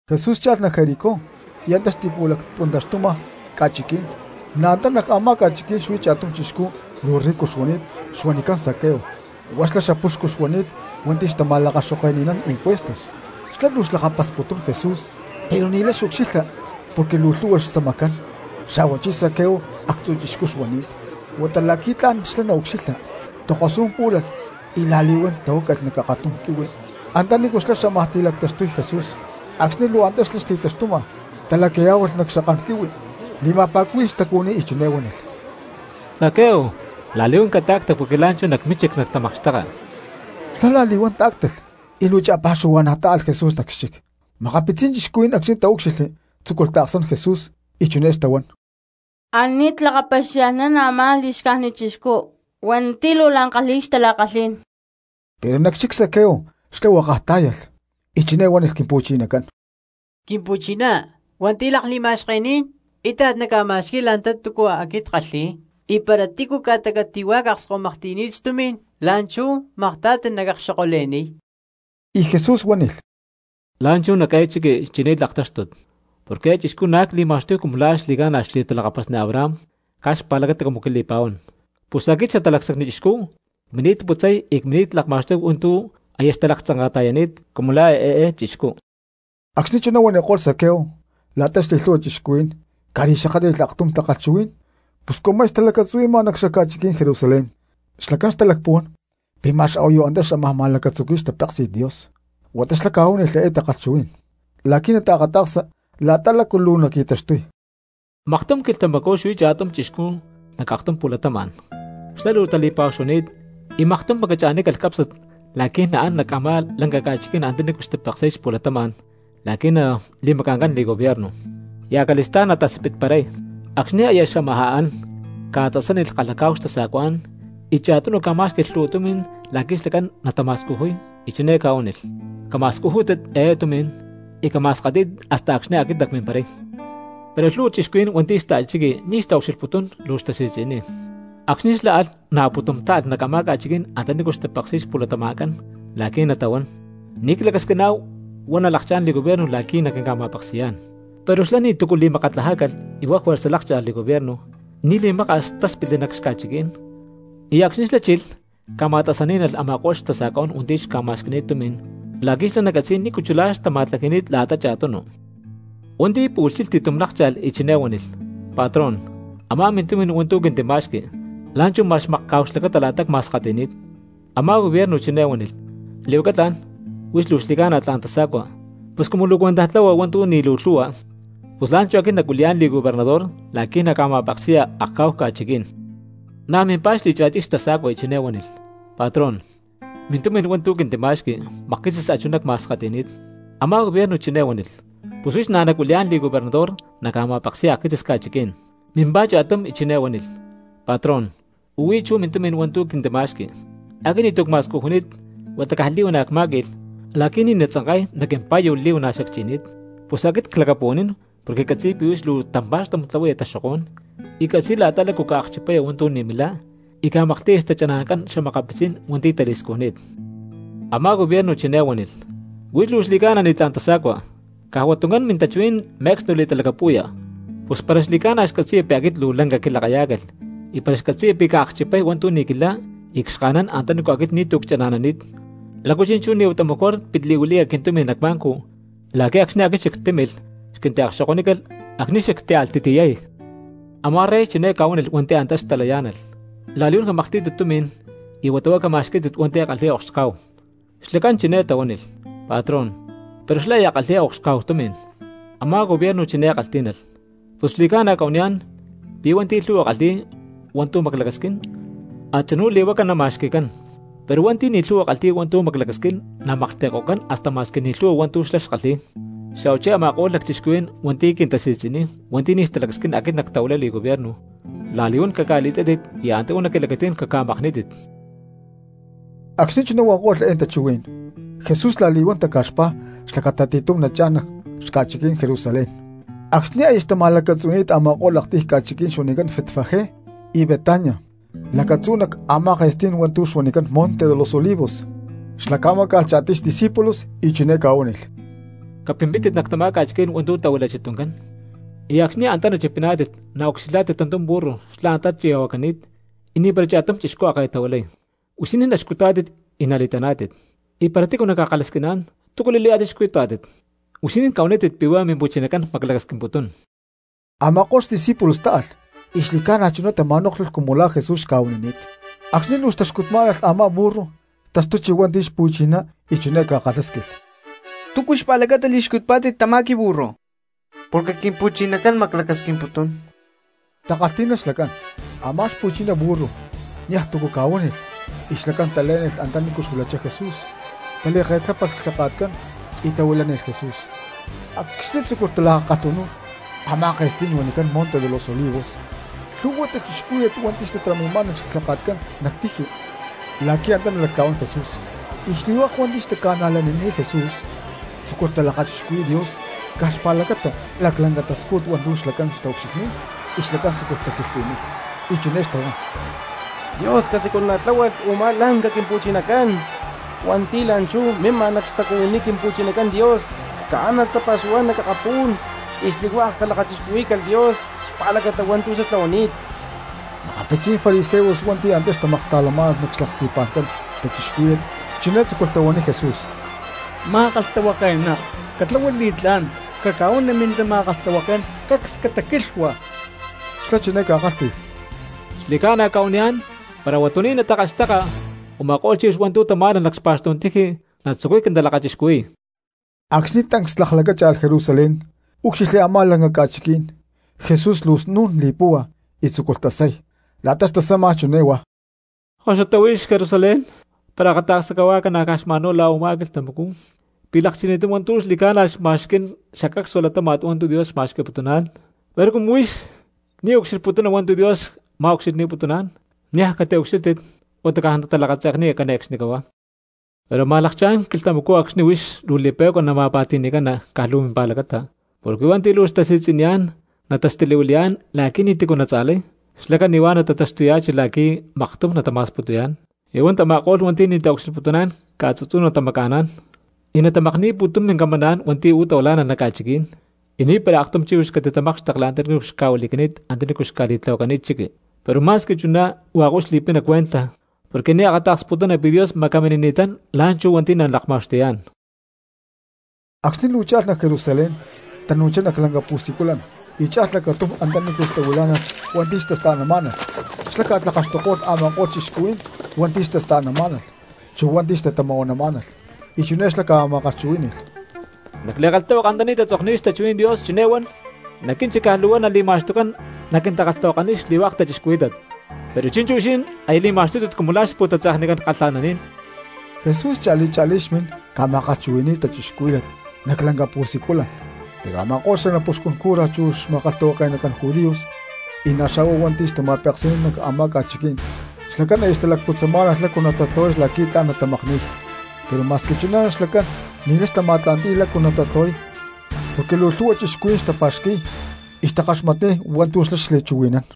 Jesús cha̠lh nac Jericó y antá xti̠pu̠lacpuntaxtuma ca̠chiquí̠n. Na̠ antá nac a̠má ca̠chiquí̠n xuí cha̠tum chixcú luu rico xuani̠t xuanicán Zaqueo. Huá xlá xapuxcu xuani̠t hua̠nti̠ xtama̠lakaxoke̠nán impuestos. Xlá luu xlakapasputún Jesús pero ni̠lay xucxilha porque luu lhu̠hua xtzamacán, xa̠huachí Zaqueo actzu̠ chixcú xuani̠t. Huata la̠qui̠ tla̠n xlá naucxilha, tokosú̠n pú̠lalh y la̠li̠huán tahuácalh nac akatum quihui antanícu xlá xámaj ti̠lactaxtuy Jesús. Acxni̠ luu antá xlá xti̠taxtuma talacayá̠hualh nac xakán quihui, li̠ma̠pá̠cuhui̠lh xtacuhui̠ní y chiné huánilh: —Zaqueo, la̠li̠huán cata̠cta porque la̠nchú nac mínchic nactamakxteka. Xlá la̠li̠huán tá̠ctalh y luu cha̠pa̠xuhua̠na̠ tá̠alh Jesús nac xchic. Makapitzí̠n cristianos acxni̠ taúcxilhli tzúculh taaksán Jesús y chiné xtahuán: —Ani̠t lakapaxia̠lhnán a̠má li̠xcájnit chixcú hua̠nti̠ luu la̠n kalhi̠y xtala̠kalhí̠n. Pero nac xchic Zaqueo xlá huákaj tá̠yalh y chiné huánilh Quimpu̠chinacán: —Quimpu̠chiná, hua̠nti̠ lakli̠ma̠xkení̠n íta̠t nacca̠ma̠xqui̠y la̠ta túcua aquit ckalhi̠y; y para tícu ca̠ta catu̠huá cakskahuimaklhti̠ni̠t xtumi̠n, la̠nchú makta̠ti nacakxokole̠niy. Y Jesús huánilh: —La̠nchú nac eé chiqui chini̠t laktáxtut, porque eé chixcú na̠ cli̠ma̠xtuy cumu la̠ xli̠ca̠na xli̠talakapasni Abraham caj xpa̠lacata cumu quili̠pa̠huán. Pus aquit Xatalacsacni Chixcú cmini̠t putzay y cmini̠t lakma̠xtuy hua̠nti̠ aya xtalaktzanka̠ta̠yani̠t cumu la̠ eé chixcú. Acxni̠ chuná huaniko̠lh Zaqueo, la̠ta xli̠lhu̠hua cristianos ca̠li̠xakátli̠lh aktum takalhchuhuí̠n. Pus cumu aya xtalacatzuhui̠ma nac xaca̠chiquí̠n Jerusalén xlacán xtalacpuhuán pi̠ ma̠x a̠huayu antá xámaj ma̠lacatzuqui̠y xtapéksi̠t Dios. Huata xlá ca̠huánilh eé takalhchuhuí̠n la̠qui̠ nataakata̠ksa la̠ta lácu luu naqui̠taxtuy: —Maktum quilhtamacú xuí cha̠tum chixcú nac aktum pu̠latama̠n. Xlá luu tali̠pa̠hu xuani̠t, y maktum macachinícalh cápsnat la̠qui̠ naán nac a̠má lanca ca̠chiquí̠n antanícu xtapeksi̠y xpu̠latama̠n la̠qui̠ nali̠maca̠ncán li̠gobierno, y acali̠stá̠n nataspitparay. Acxni̠ aya xamajá an ca̠tasánilh kalhacá̠hu xtasa̠cuá̠n, y cha̠tunu ca̠má̠xqui̠lh lhu̠hua tumi̠n la̠qui̠ xlacán natama̠scujuy y chiné ca̠huánilh: “Cama̠scujútit eé tumi̠n y cama̠skatí̠tit hasta acxni̠ aquit nacmimparay.” Pero lhu̠hua cristianos hua̠nti̠ xta̠chiqui ni̠ xtaucxilhputún luu xtasi̠tzi̠niy, acxni̠ xlá alh na̠ pu̠tum táalh nac a̠má ca̠chiquí̠n antanícu xtapeksi̠y xpu̠latama̠ncán la̠qui̠ natahuán: “Ni̠ clacasquiná̠hu huá nalakchá̠n li̠gobierno la̠qui̠ naquinca̠ma̠peksi̠yá̠n.” Pero xlá ni̠tu̠cu li̠makatlajácalh y huá juerza lákcha̠lh li̠gobierno; y ni̠ li̠maka̠s xlá táspitli nac xca̠chiquí̠n. Y acxni̠ xlá chilh ca̠ma̠tasaní̠nalh a̠ma̠ko̠lh xtasa̠cuá̠n hua̠nti̠ xca̠ma̠xqui̠ni̠t xtumi̠n la̠qui̠ xlá nacatzi̠y nícu chulá xtama̠tlaji̠ni̠t la̠ta cha̠tunu. Hua̠nti̠ pu̠lh chilh ti̠tum lákcha̠lh y chiné huánilh: “Patrón, a̠má mintumi̠n hua̠ntu̠ quintima̠xqui, la̠nchú ma̠x makca̠hu xlacata la̠ta cma̠skawi̠ni̠t.” Amá gobierno chiné huánilh: “Li̠huaca tla̠n, huix luu xli̠ca̠na tla̠n tasa̠cua; pus cumu luu cuentaj tlahua hua̠ntu̠ ni̠ luu lhu̠hua, pus la̠nchú aquit nacuili̠yá̠n li̠gobernador la̠qui̠ naca̠ma̠peksi̠ya akcá̠hu ca̠chiquí̠n.” Na̠ mimpá xli̠cha̠tiy xtasa̠cua y chiné huánilh: “Patrón, mintumi̠n hua̠ntu̠ quintima̠xqui, makquitzis a̠chuná cma̠skati̠ni̠t.” Amá gobierno chiné huánilh: “Pus huix na̠ nacuili̠yá̠n li̠gobernador naca̠ma̠peksi̠ya akquitzis ca̠chiquí̠n.” ’Mimpá cha̠tum y chiné huánilh: “Patrón, u̠huí chú mintumi̠n hua̠ntu̠ quintima̠xqui. Aquit ni̠tu̠ cma̠scujuni̠t huata caj li̠huana̠ cmá̠qui̠lh, la̠qui̠ ni̠ natzanka̠y nac quimpa̠yu li̠huana̠ xacchi̠ni̠t. Pus aquit clacapuhuanín porque ccatzi̠y pi̠ huix luu tampa̠xtum tlahuaya taxokó̠n, y ccatzi̠y la̠ta lácu ca̠akchipaya hua̠ntu̠ ni̠ milá y ca̠maklhti̠ya xtachana̠ncán xa̠makapitzí̠n hua̠nti̠ tali̠scujni̠t.” Amá gobierno chiné huánilh: “Huix luu xli̠ca̠na ni̠tlá̠n tasa̠cua, caj hua tuncán mintachuhuí̠n me̠cstu li̠talacapu̠ya, pus para xli̠ca̠na xcatzi̠ya pi̠ aquit luu lanca quilakayá̠calh, y para xcatzi̠ya pi̠ cakchipay hua̠ntu̠ ni̠ quilá y cxka̠nán antanícu aquit ni̠tu̠ chana̠nani̠t, ¿lácu chi̠nchú ni̠ huata mejor pit li̠huili̠ya quintumi̠n nac banco la̠qui̠ acxni̠ aquit xactímilh xquintiakxokonícalh acxni̠ xactíalh ti̠tiyay?” Amá rey chiné ca̠huánilh hua̠nti̠ antá xtalayá̠nalh: “La̠li̠huán camaklhtí̠tit tumi̠n, y huata huá cama̠xquí̠tit hua̠nti̠ kalhi̠y okxcá̠hu.” Xlacán chiné tahuánilh: “Patrón, pero xlá aya kalhi̠y okxcá̠hu tumi̠n.” Amá gobierno chiné kalhtí̠nalh: “Pus xli̠cána cca̠huaniyá̠n pi̠ hua̠nti̠ lhu̠hua kalhi̠y hua̠ntu̠ maclacasquín, a̠tzinú li̠huaca nama̠xqui̠cán; pero hua̠nti̠ ni̠ lhu̠hua kalhi̠y hua̠ntu̠ maclacasquín namaklhti̠ko̠cán hasta ma̠squi ni̠ lhu̠hua hua̠ntu̠ xlá kalhi̠y. Xa̠huachí a̠ma̠ko̠lh lacchixcuhuí̠n hua̠nti̠ quintasi̠tzi̠niy hua̠nti̠ ni̠ xtalacasquín aquit nactahuilay li̠gobierno, la̠li̠huán caca̠li̠tátit y anta uú nac quilacatí̠n caca̠makní̠tit.” Acxni̠ chuná huanko̠lh eé tachuhuí̠n Jesús la̠li̠huán taca̠xpá xlacata ti̠tum nachá̠n nac xaca̠chiquí̠n Jerusalén. Acxni̠ aya xtama̠lacatzuhui̠ni̠t a̠ma̠ko̠lh aktiy ca̠chiquí̠n ca̠huanicán Betfagé y Betania lacatzú nac a̠má ke̠stí̠n hua̠ntu̠ xuanicán Monte de los Olivos, xlá ca̠máca̠lh cha̠tiy xdiscípulos, y chiné ca̠huánilh: —Capimpítit nac tamá ca̠chiquí̠n hua̠ntu̠ tahuilachi tuncán, y acxni̠ antá nachipiná̠tit naucxilhá̠tit tantum burru xlá antá chi̠ya̠huacani̠t y ni̠para cha̠tum chixcú a̠ ke̠tahuilay. Huixinín naxcutá̠tit y nali̠taná̠tit. Y para tícu naca̠kalhasquiná̠n: “¿Túcu li̠layá̠tit xcutá̠tit?” huixinín cahuanítit pi̠ huá Mimpu̠chinacán maclacasquimputún. Ama̠ko̠lh diesípulos táalh y xli̠ca̠na chuná tama̠nóklhulh cumu la̠ Jesús xca̠huanini̠t. Acxni̠ luu xtaxcutmá̠nalh a̠má burru taxtuchi hua̠nti̠ xpu̠chiná y chiné ca̠kalhásquilh: —¿Túcu xpa̠lacata li̠xcutpá̠tit tamá quiburru? —Porque Quimpu̠chinacán maclacasquimputún —takalhtí̠nalh xlacán. Amá xpu̠chiná burru niaj tu̠ ca̠huánilh y xlacán talé̠nilh antanícu xuilachá Jesús, tali̠ke̠tlápalh clhaka̠tcán y tahuilánilh Jesús. Acxni̠ tzúculh talakakalhu̠y a̠má ke̠stí̠n huanicán Monte de los Olivos lhu̠hua cristianos hua̠nti̠ xtatarami̠má̠nalh clhaka̠tcán nac tiji la̠qui̠ antá nalactla̠huán Jesús. Y xli̠hua̠k hua̠nti̠ xtaca̠najlanini̠t Jesús tzúculh talakachixcuhui̠y Dios caj xpa̠lacata laclanca xtascújut hua̠ntu̠ xlacán xtaucxilhni̠t y xlacán tzúculh taquilhtli̠niy, y chiné xtahuán: —¡Dios casiculana̠tláhualh u̠má lanca quimpuxcucán hua̠nti̠ la̠nchú mima nac xtacuhuiní Quimpu̠chinacán Dios! Caánalh tapa̠xuhuá̠n nac akapú̠n y xli̠hua̠k calakachixcuhuí̠calh Dios xpa̠lacata hua̠ntu̠ xlá tlahuani̠t. Makapitzí̠n fariseos hua̠nti̠ na̠ antá xtamaksta̠lamá̠nalh nac xlaksti̠pa̠ncán cristianos, chiné tzúculh tahuaniy Jesús: —Ma̠kalhtahuake̠ná, catlahua li̠tlá̠n caca̠huani mintama̠kalhtahuaké̠n cacs cataquilhua. Xlá chiné ca̠kálhti̠lh: —Xli̠ca̠na cca̠huaniyá̠n, para huatuní̠n natakalhxteka, u̠ma̠ko̠lh chíhuix hua̠ntu̠ tamá̠nalh nac xpa̠xtú̠n tiji natzucuy quintalakachixcuhui̠y. Acxni̠ tancs laklacácha̠lh Jerusalén, úcxilhli a̠má lanca ca̠chiquí̠n Jesús luu snu̠n li̠púhua y tzúculh tasay. La̠ta xtasama chiné huá: —¡Koxutá huix Jerusalén! ¡Para akata̠ksa cahuá ca̠na caj xma̠n huá la̠ u̠má quilhtamacú pi̠ lakchini̠tán hua̠ntu̠ xli̠ca̠na xma̠xquí̠n xacacsua latáma̠t hua̠ntu̠ Dios ma̠xqui̠putuná̠n! Pero cumu huix ni̠ xucxilhputuna hua̠ntu̠ Dios xma̠cuxilhni̠putuná̠n, niaj naucxilhá̠tit huata caj talakatze̠kniya nahuán cane̠cxnicahuá. Pero amá̠n lakcha̠ná̠n quilhtamacú acxni̠ huix luu li̠pe̠cua la̠ nama̠pa̠ti̠ni̠cana caj luu mimpa̠lacata, porque hua̠nti̠ luu tasi̠tzi̠niyá̠n natastilihuili̠yá̠n la̠qui̠ ni̠ti̠cu natza̠lay, xlá cani̠huá natataxtuya̠chi la̠qui̠ maktum natama̠sputuyá̠n. Y hua̠ntama̠ko̠lh hua̠nti̠ ni̠ taucxilhputuná̠n ca̠tu̠tzú natamaca̠ná̠n, y natamakni̠y pu̠tum mincamancán hua̠nti̠ uú tahuilá̠nalh nac ca̠chiquí̠n; y ni̠para aktum chíhuix catitamákxtekli antanícu xca̠huili̠cani̠t hua̠ntu̠ xca̠li̠tlahuacani̠t chiqui. Pero ma̠squi chuná hua̠k huix li̠pina cuenta porque ni̠ akata̠ksputuna pi̠ Dios macaminini̠tán la̠nchú hua̠nti̠ nalakma̠xtuyá̠n. Acxni̠ luu cha̠lh nac Jerusalén tanu̠chá nac lanca pu̠siculan y cha̠lh lacatum antanícu xtahuilá̠nalh hua̠nti̠ xtasta̠namá̠nalh; xlá ca̠tlakaxtuko̠lh a̠ma̠ko̠lh cristianos hua̠nti̠ xtasta̠namá̠nalh chu hua̠nti̠ xtatama̠huanamá̠nalh. Y chiné xlá ca̠ma̠kalhchuhuí̠ni̠lh: —Nac li̠kalhtahuaka antanícu tatzokni̠t xtachuhuí̠n Dios chiné huan: “Nac quínchic caj luu huá nali̠ma̠xtucán naquintakalhtahuakaniy xli̠hua̠k cristianos”; pero chi̠nchú huixinín aya li̠ma̠xtuni̠tátit cumu la̠ xpu̠tatze̠knicán kalha̠naní̠n. Jesús cha̠li cha̠lí xmin ca̠ma̠kalhchuhui̠ni̠y cristianos nac lanca pu̠siculan; pero a̠ma̠ko̠lh xanapuxcun cura chu xma̠kalhtahuake̠nacán judíos, y na̠ xa̠hua hua̠nti̠ xtama̠peksi̠nán nac a̠má ca̠chiquí̠n, xlacán aya xtalacputzamá̠nalh lácu natatlahuay la̠quí tla̠n natamakni̠y. Pero ma̠squi chuná xlacán ni̠lay xtama̠tla̠nti̠y lácu natatlahuay porque luu lhu̠hua cristianos xtapa̠xqui̠y y xtakaxmatniy hua̠ntu̠ xlá xli̠chuhui̠nán.